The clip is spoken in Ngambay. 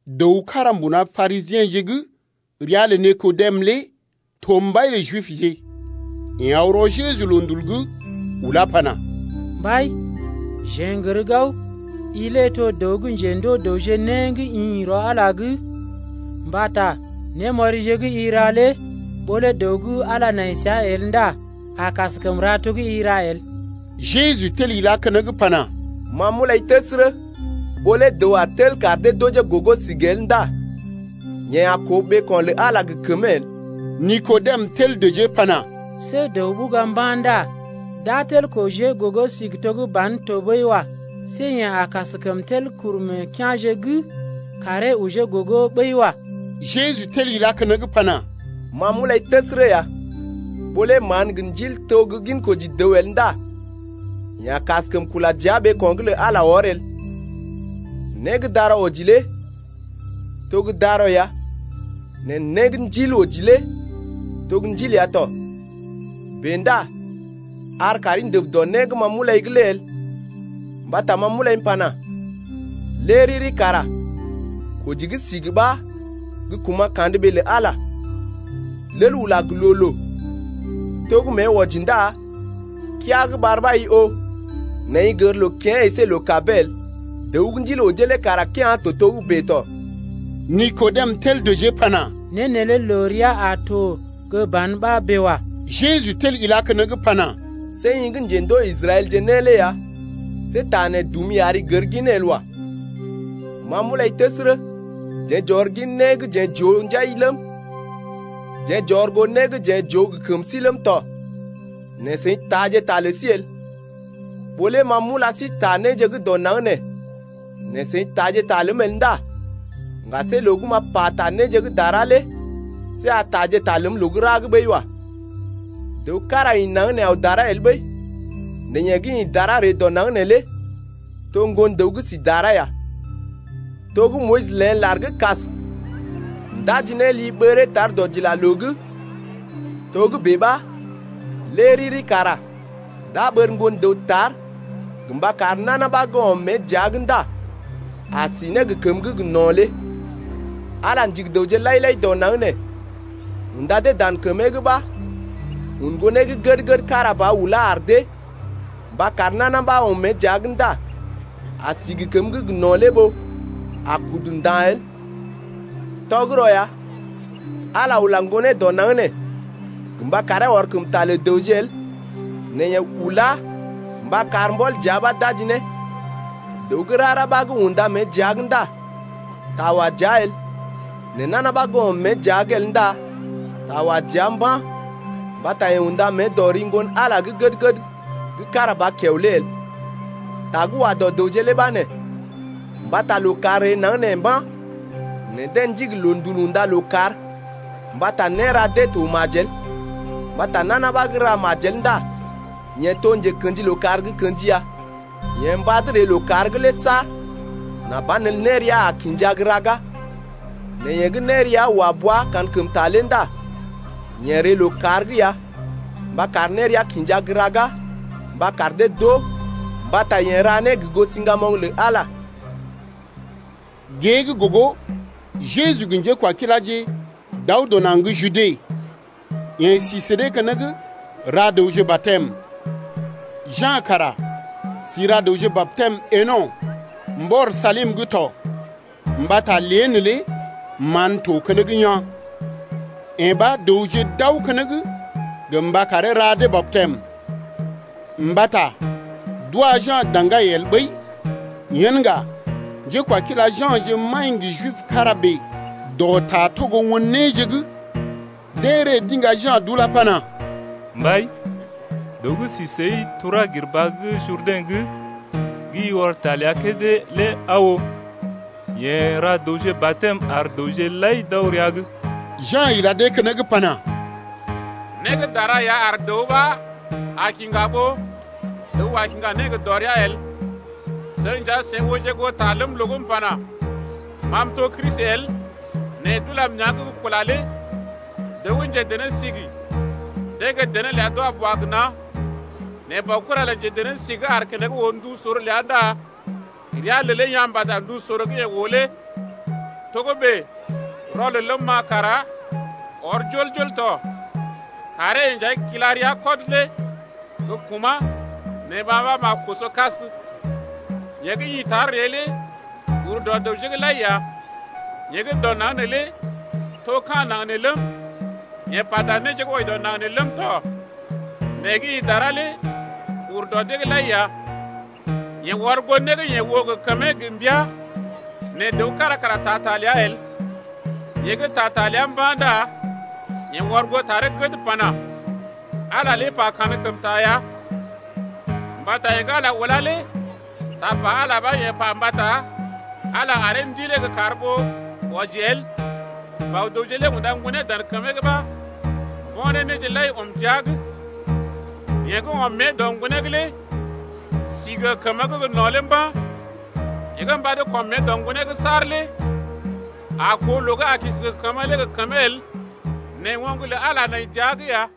Dəw kára mbuna Parisiḛje ria lə Nikodem lé to mbai lə Jibje. Yeḛ aw rɔ Jeju loondul’g ulá pana: Mbai, jeḛ n’gər gao i lé to gə́ dəw gə́ njendoo dəwje né gə́ ḭ rɔ Ala’g, mbata némɔrije gə́ i ra lé ɓó lé dəw gə́ Ala nai səa el ndá a kaskəm ra to gə́ i ra el. Jeju tel ilá keneŋ pana: Ma m’ulai təsərə, ɓó lé dəw a tel kar dee d’ojee gogo sigi el ndá yeḛ a koo ɓeeko̰ lə Ala lé gə kəmee el. Nikodem tel dəjee pana: See dəw ɓuga mba̰ ndá d’a tel kojee gogo sigi to gə́ ban tɔɓəi wa. See yeḛ a kaskəm tel kuru meḛ kea̰je’g karee ojee gogo ɓəi wa. Jeju tel ilá keneŋ pana: Ma m’ulai təsərə ya, ɓó lé mán gə ndil to gə́ gin koji dəw el ndá yeḛ a kaskəm kula dəa ɓeeko̰’g lə Ala wɔr el. Né gə́ darɔ oji lé to gə́ darɔ ya, nɛ né gə́ ndil oji lé to ndil ya tɔ. Bèe ndá ar kaari ndəb dɔ né gə́ ma m’ulai’g lé el, mbata ma m’ulai m’pana: Lé riri kara koji gə́ sigi ɓa gə kuma̰ kandə ɓee lə Ala ya. Lel ula gə loo-loo to gə́ mée wɔji ndá keaa gə́ ɓar ɓa i oo, nɛ i gər loo kḭyee əsé loo-kabee el. Dəw gə́ ndil ojee lé kara kea̰ to togə́bè tɔ. Nikodem tel dəjee pana: Né neelé loo rəa a to gə́ ban ɓa bèe wa. Jeju tel ilá keneŋ pana: See i gə́ njendoo Israɛlje né lé ya, see ta nee dumi ari gər ginee el wa. Ma m’ulai təsərə, jeḛ j’ɔr gin né gə́ jeḛ j’oo njai ləm, jeḛ j’ɔr goo né gə́ jeḛ j’oo gə kəm sí ləm tɔ, nɛ seḭ taaje ta lə sí el. Ɓó lé ma m’ula sí ta néje gə́ dɔ naŋg nee, nɛ seḭ taaje ta ləm el ndá ŋga see loo gə́ m’a pata néje gə́ dara lé see a taaje ta ləm loo gə́ ra’g ɓəi wa. Dəw kára ḭ naŋg nee aw dara el ɓəi, nɛ yeḛ gə́ ḭ dara ree dɔ naŋg neelé to Ŋgon-dəw gə́ si dara ya. To gə́ Moyis léḛ lar gə́ kas ndaji ne li ɓəree tar dɔdilaloo’g, togə́bè ɓa lé riri kara d’a ɓər Ŋgon-dəw tar gə mba kar nana ɓa gə́ ɔm mée dəa’g ndá a si ne gə kəməgə́ gə no̰ lé. Ala ndigi dəwje lai-lai dɔ naŋg nee, unda dee dan kəmee’g ɓa un Ŋgonee gə́ gəd-gəd kára ba ulá ar dee mba kar nana ɓa gə́ ɔm mée dəa’g ndá a si gə kəməgə́ gə no̰ lé ɓó a kudu nda̰ el. Tɔgərɔ ya, Ala ula Ŋgonee dɔ naŋg nee gə mba karee ɔr kəm ta lə dəwje el nɛ yeḛ ulá mba kar mbɔl dəa ɓa d’aji ne. Dəw gə́ rara ɓa gə́ unda mée dəa’g ndá ta wa dəa el, nɛ nana ɓa gə́ ɔm mée dəa’g el ndá ta wa dəa mba̰ mbata yeḛ unda mée dɔ ri Ŋgon-Ala gə́ gəd-gəd gə́ kára ba kiao lé el. Ta gə́ wa dɔ dəwje lé ɓa nee: mbata lookàr ree naŋg nee mba̰ nɛ deḛ ndigi loondul unda lookàr mbata néra dee to majel. Mbata nana ɓa gə́ ra majel ndá yeḛ to njekḛji lookàr gə́ kḛji ya, yeḛ mbad ree lookàr’g lé saar, nà banelə nérea a kinja gə́ raga. Nɛ yeḛ gə́ nérea wa bua kankəmta lé ndá yeḛ ree lookàr’g ya mba kar nérea kinja gə́ raga mba kar dee d’oo mbata yeḛ ra né gə goo siŋgamoŋ lə Ala ya. Gée gə́ gogo, Jeju gə njékwakiláje d’aw dɔ naŋg gə́ Jude. Yeḛ si sə dee keneŋ ra dəwje batɛm. Ja̰ kara si ra dəwje batɛm Eno̰ mbɔr Salim’g tɔ mbata lée neelé mán to keneŋ yaa̰. Yee ɓa dəwje d’aw keneŋ gə mba karee ra dee batɛm. Mbata d’wa Ja̰ daŋgai el ɓəi. Yen ŋga njékwakila Ja̰je maḭ gə Jib kára bèe dɔ ta togo won néje’g. Deḛ ree d’iŋga Ja̰ d’ulá pana: Mbai, dəw gə́ si səi tura gir baa gə́ Jurdɛ̰’g gə́ i ɔr ta ləa kédé lé aa oo, yeḛ ra dəwje batɛm ar dəwje lai d’aw rəa’g. Ja̰ ila dee keneŋ pana: Né gə́ dara ya ar dəw ɓa a kiŋga ɓó dəw a kiŋga né gə dɔrea el. Seḭ nja seḭ ooje goo ta ləm loo gə́ m’pana: Ma m’to Kristi el nɛ d’ulam nea̰’g gə kula lé. Dəw gə́ njedené-sigi, deḛ gə dené ləa d’wa boa gə na̰, nɛ baokura lə njedené-sigi gə́ aar keneŋ oo ndu sor ləa ndá rəa lelee yaa̰ mbata ndu sor gə́ yeḛ oo lé. Togə́bè rɔlel ləm-ma kara ɔr jol-jol tɔ. Karee-yeḛ nja kila rəa kɔd lé gə́ kumá̰ nɛ ma ɓa m’a koso kas. Yeḛ gə́ ḭ tar ree lé ur dɔ dəwje’g lai ya, yeḛ gə́ dɔ naŋg nee lé to ka̰ naŋg nee ləm, yeḛ pata néje gə́ wɔji dɔ naŋg nee ləm tɔ. Nɛ yeḛ gə́ ḭ dara ree lé ur dɔ dee’g lai ya. Yeḛ ɔr goo né gə́ yeḛ oo gə kəmee gə mbia nɛ dəw kára kara taa ta ləa el. Yeḛ gə́ taa ta ləa mba̰ ndá yeḛ ɔr goo taree gəd pana: Ala lé pa kankəmta ya, mbata yeḛ gə́ Ala ulá lé tapa Ala lé ɓa yeḛ pa mbata Ala lé aree Ndilee gə́ kar ɓó wɔji el. Bɔ-dəwje lé unda Ŋgonee dan kəmee’g ɓa mbo̰ ne néje lai ɔm jia’g. Yeḛ gə́ ɔm mée dɔ Ŋgonee’g lé si gə kəməgə́ gə no̰ lé mba̰, yeḛ gə́ mbad kɔm mée dɔ Ŋgonee’g saar lé a koo loo gə́ a kisi gə kəmə lé gə kəmee el nɛ oŋg lə Ala nai dəa’g ya.